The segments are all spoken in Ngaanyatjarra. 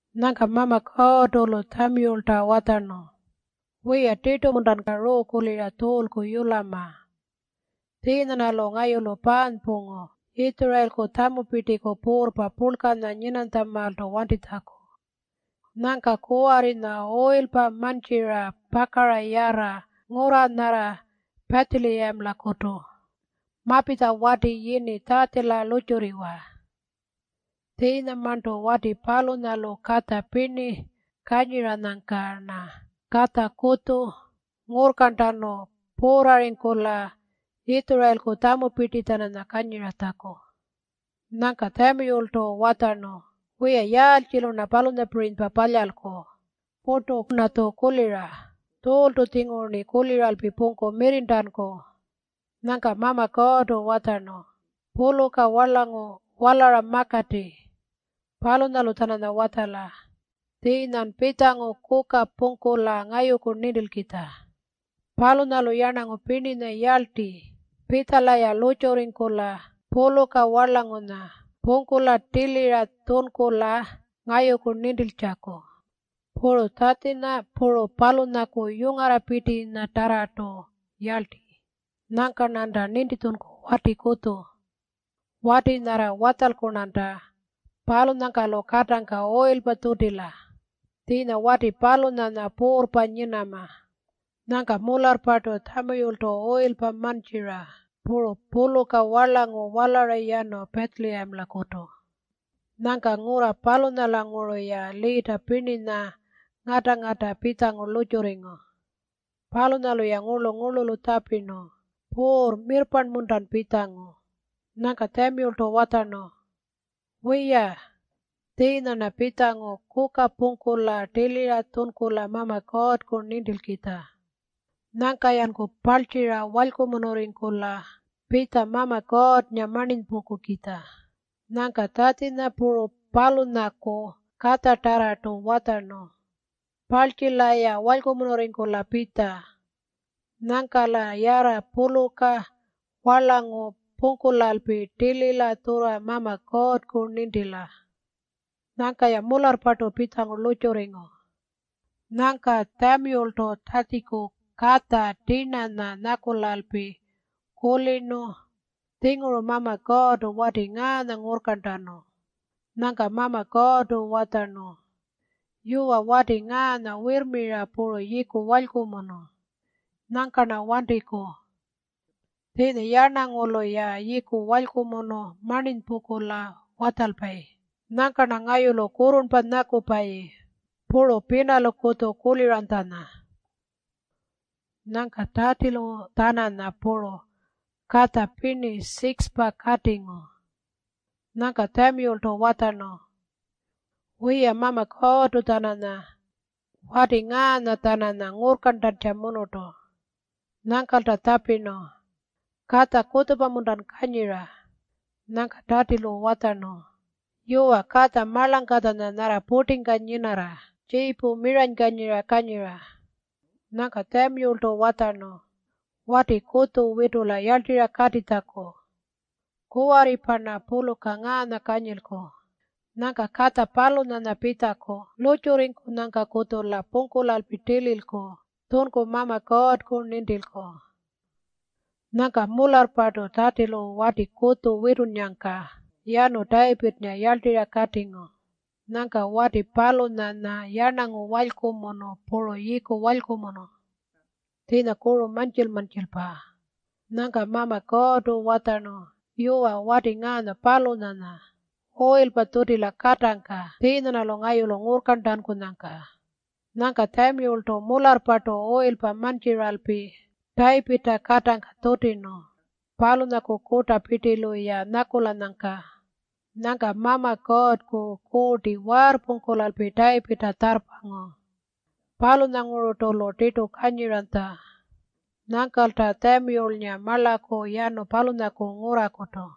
Nyangka Mama Kuurrtu-lu Tjamiyulta watjarnu, “Wiya, tirtu-muntan ruukulira Tjuulku yulama? Tjiinya-rnalu ngayulu paanypungu Yitjurayilku tjamupirtiku puurrpa purlkanya nyinarranytjamaaltu wantitjaku. Nyangka kuwarrinya uyilpa mantjira pakara yarra ngurra nyarra Pitjiliyamaku. Mapitja wati yini Tjatjila lurrtjurriwa. Tjiinyamarntu wati palunyalu katja pirni kanyiranyangka-rna katja kutju ngurrkarntanu puurrarringkula Yitjurayilku tjamupirti-tjananya kanyiratjaku.” Nyangka Tjamiyultu watjarnu, “Wiya, yaaltjilu-rna palunyapirinypa palyalku? Purtu-rnatju kulira. Tjuultu-tjinguru-rni kuliralpi pungku mirrirntanku.” Nyangka Mama Kuurrtu watjarnu, “Puluka warlangu walara makati. Palunyalu-tjananya watjala tjiinyan pitjangu kuka pungkula ngayuku nintilkitja. Palunyalu yarnangu pirninya yarlti pitjala-ya lurrtjurringkula puluka warlangunya pungkula tilira tjunkula ngayuku nintiltjaku. Puru Tjatjinya puru palunyaku yungarrapirtitarrartu yarlti. Nyangka-rnanta nintitjunku wati kutju. Wati nyarra watjalku-rnanta, palunyangka-lu katangka uyilpa tjutila. Tjiinya wati palunyanya puurrpa nyinama.” Nyangka mularrpartu Tjamiyultu uyilpa mantjira puru puluka warlangu walara yanu Pitjiliyamalakutu. Nyangka ngurra palunyanguru-ya liita pirninya ngata-ngata pitjangu lurrtjurringu. Palunyalu-ya ngurlu-ngurlulu tjapirnu, “Puurr, mirrparnpa-muntan pitjangu?” Nyangka Tjamiyultu watjarnu, “Wiya. Tjiinya-rna pitjangu kuka pungkulalpi tilira tjunkula Mama Kuurrku nintilkitja. Nyangka-yanku parltjira walykumunurringkula pitja Mama Kuurrnga marninypungkukitja.” Nyangka Tjatjinya puru palunyaku katjatarrartu watjarnu, “Parltjila-ya walykumunurringkula pitja. Nyangka-la yarra puluka warlangu pungkulalpi tilila tjurra Mama Kuurrku nintila.” Nyangka-ya mularrpartu pitjangu lurrtjurringu. Nyangka Tjamiyultu Tjatjiku katja tirnanya nyakulalpi kulirnu, “Tjinguru Mama Kuurrtu wati ngaanya ngurrkarntanu.” Nyangka Mama Kuurrtu watjarnu, “Yuwa, wati ngaanya wirrmira puru yiiku walykumunu. Nyangka-rna wantiku. Tjiinya yarnangulu-ya yiiku walykumunu marninypungkula watjalpayi. Nyangka-rna ngayulu kurrurnpa nyakupayi puru pinalukutju kuliranytjanya.” Nyangka Tjatjilu-tjananya puru katja pirni 6-pa katingu. Nyangka Tjamiyultu watjarnu, “Wiya, Mama Kuurrtu-tjananya wati ngaanya-tjananya ngurrkarntankutjamunurtu.” Nyangkalta tjapirnu, “Katja kutjupa-muntan kanyira?” Nyangka Tjatjilu watjarnu, “Yuwa, katja marlangkatjanya nyarra purtingka nyinarra tjiipu miranykanyira kanyira.” Nyangka Tjamiyultu watjarnu, “Wati kutju witula yarltirra katitjaku. Kuwarripa-rna puluka ngaanya kanyilku. Nyangka katja palunyanya pitjaku lurrtjurrinyangkakutju-la pungkulalpi tililku tjunku Mama Kuurrku nintilku.” Nyangka mularrpartu Tjatjilu wati kutju witunnyangka yanu Tayipirrnga yarltirra katingu. Nyangka wati palunyanya yarnangu walykumunu puru yiiku walykumunu. Tjiinya kuru mantjil-mantjilpa. Nyangka Mama Kuurrtu watjarnu, “Yuwa, wati ngaanya palunyanya. Uyilpa tjutila katangka tjiinya-rnalu ngayulu ngurrkarntankunyangka.” Nyangka Tjamiyultu mularrpartu uyilpa mantjiralpi Tayipirrta katangka tjutirnu palunyaku kurtapirtilu-ya nyakulanyangka. Nyangka Mama Kuurrku Kuurti waarrpungkulalpi Tayipirrta tjarrpangu. Palunyangururtu-lu tirtu kanyiranytja. Nyangkalta Tjamiyulnga marlaku yanu palunyaku ngurrakutu.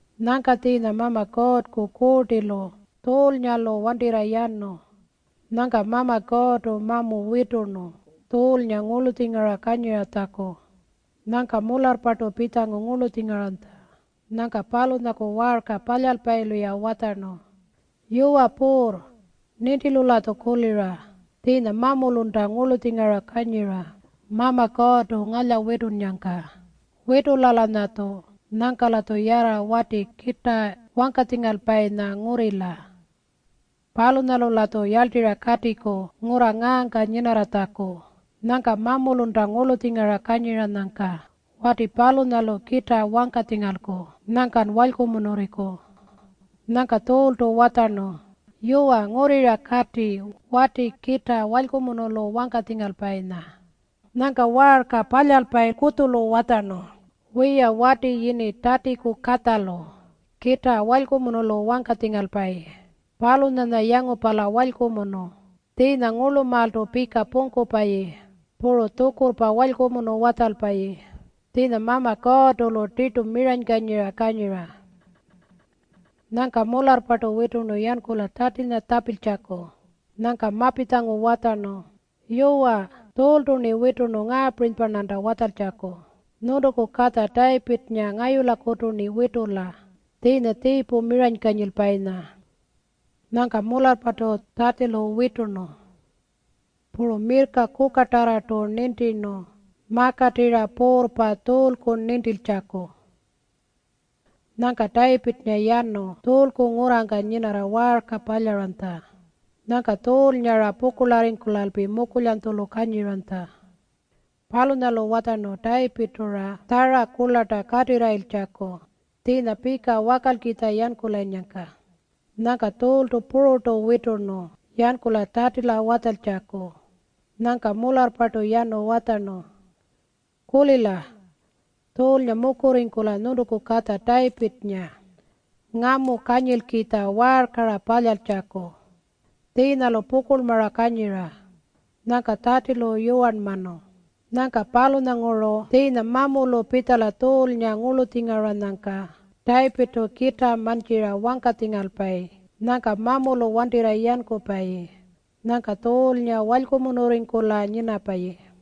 Nyangka tjiinya Mama Kuurrku Kuurtilu Tjuulnga-lu wantirra yanu. Nyangka Mama Kuurrtu mamu witurnu Tjuulnga ngurlutjingara kanyiratjaku. Nyangka mularrpartu pitjangu ngurlutjingaranytja Nyangka palunyaku waarka palyalpayilu-ya watjarnu, “Yuwa puurr, nintilu-latju kulira tjiinya mamulunta ngurlutjingara kanyira Mama Kuurrtu ngalyawitunnyangka. Witula-lanyatju. Nyangka-latju yarra wati kitaa wangkatjingalpayinya ngurrila. Palunyalu-latju yarltirra katiku ngurra ngaangka nyinarratjaku. Nyangka mamulunta ngurlutjingara kanyiranyangka wati palunyalu kitaa wangkatjingalku. Nyangkan walykumunurringku.” Nyangka Tjuultu watjarnu, “Yuwa, ngurrira kati wati kitaa walykumunulu wangkatjingalpayinya.” Nyangka waarka palyalpayi kutjulu watjarnu, “Wiya, wati yini Tjatjiku katjalu kitaa walykumunulu wangkatjingalpayi. Palunyanya yangupala walykumunu, tjiinya ngurlumaaltu pika pungkupayi, puru tjukurrpa walykumunu watjalpayi. Tjiinya Mama Kuurrtu-lu tirtu miranykanyira kanyira.” Nyangka mularrpartu witurnu yankula Tjatjinya tjapiltjaku. Nyangka mapitjangu watjarnu, “Yuwa, Tjuultu-rni witurnu ngaapirinypa-rnanta watjaltjaku, ‘Nyuntuku katja Tayipirrnga ngayulakutu-rni witula tjiinya tjiipu miranykanyilpayinya.’” Nyangka mularrpartu Tjatjilu witurnu. Puru mirrka kukatarrartu nintirnu makatirra puurrpa Tjuulku nintiltjaku. Nyangka Tayipirrnga yanu Tjuulku ngurrangka nyinarra waarka palyaranytja. Nyangka Tjuulnga-ra pukurlarringkulalpi mukulyanytjulu kanyiranytja. Palunyalu watjarnu Tayipirrtu-ra tjara kurlarta katirrayiltjaku tjiinya pika wakalkitja yankulanyangka. Nyangka Tjuultu pururtu witurnu yankula Tjatjila watjaltjaku. Nyangka mularrpartu yanu watjarnu, “Kulila. Tjuulnga mukurringkula nyuntuku katja Tayipirrnga ngamu kanyilkitja waarka-ra palyaratjaku. Tjiinya-lu pukurlmara kanyira.” Nyangka Tjatjilu yuwarnmanu. Nyangka palunyanguru tjiinya mamulu pitjala Tjuulnga ngurlutjingaranyangka Tayipirrtu kitaa mantjira wangkatjingalpayi. Nyangka mamulu wantirra yankupayi. Nyangka Tjuulnga walykumunurringkula nyinapayi.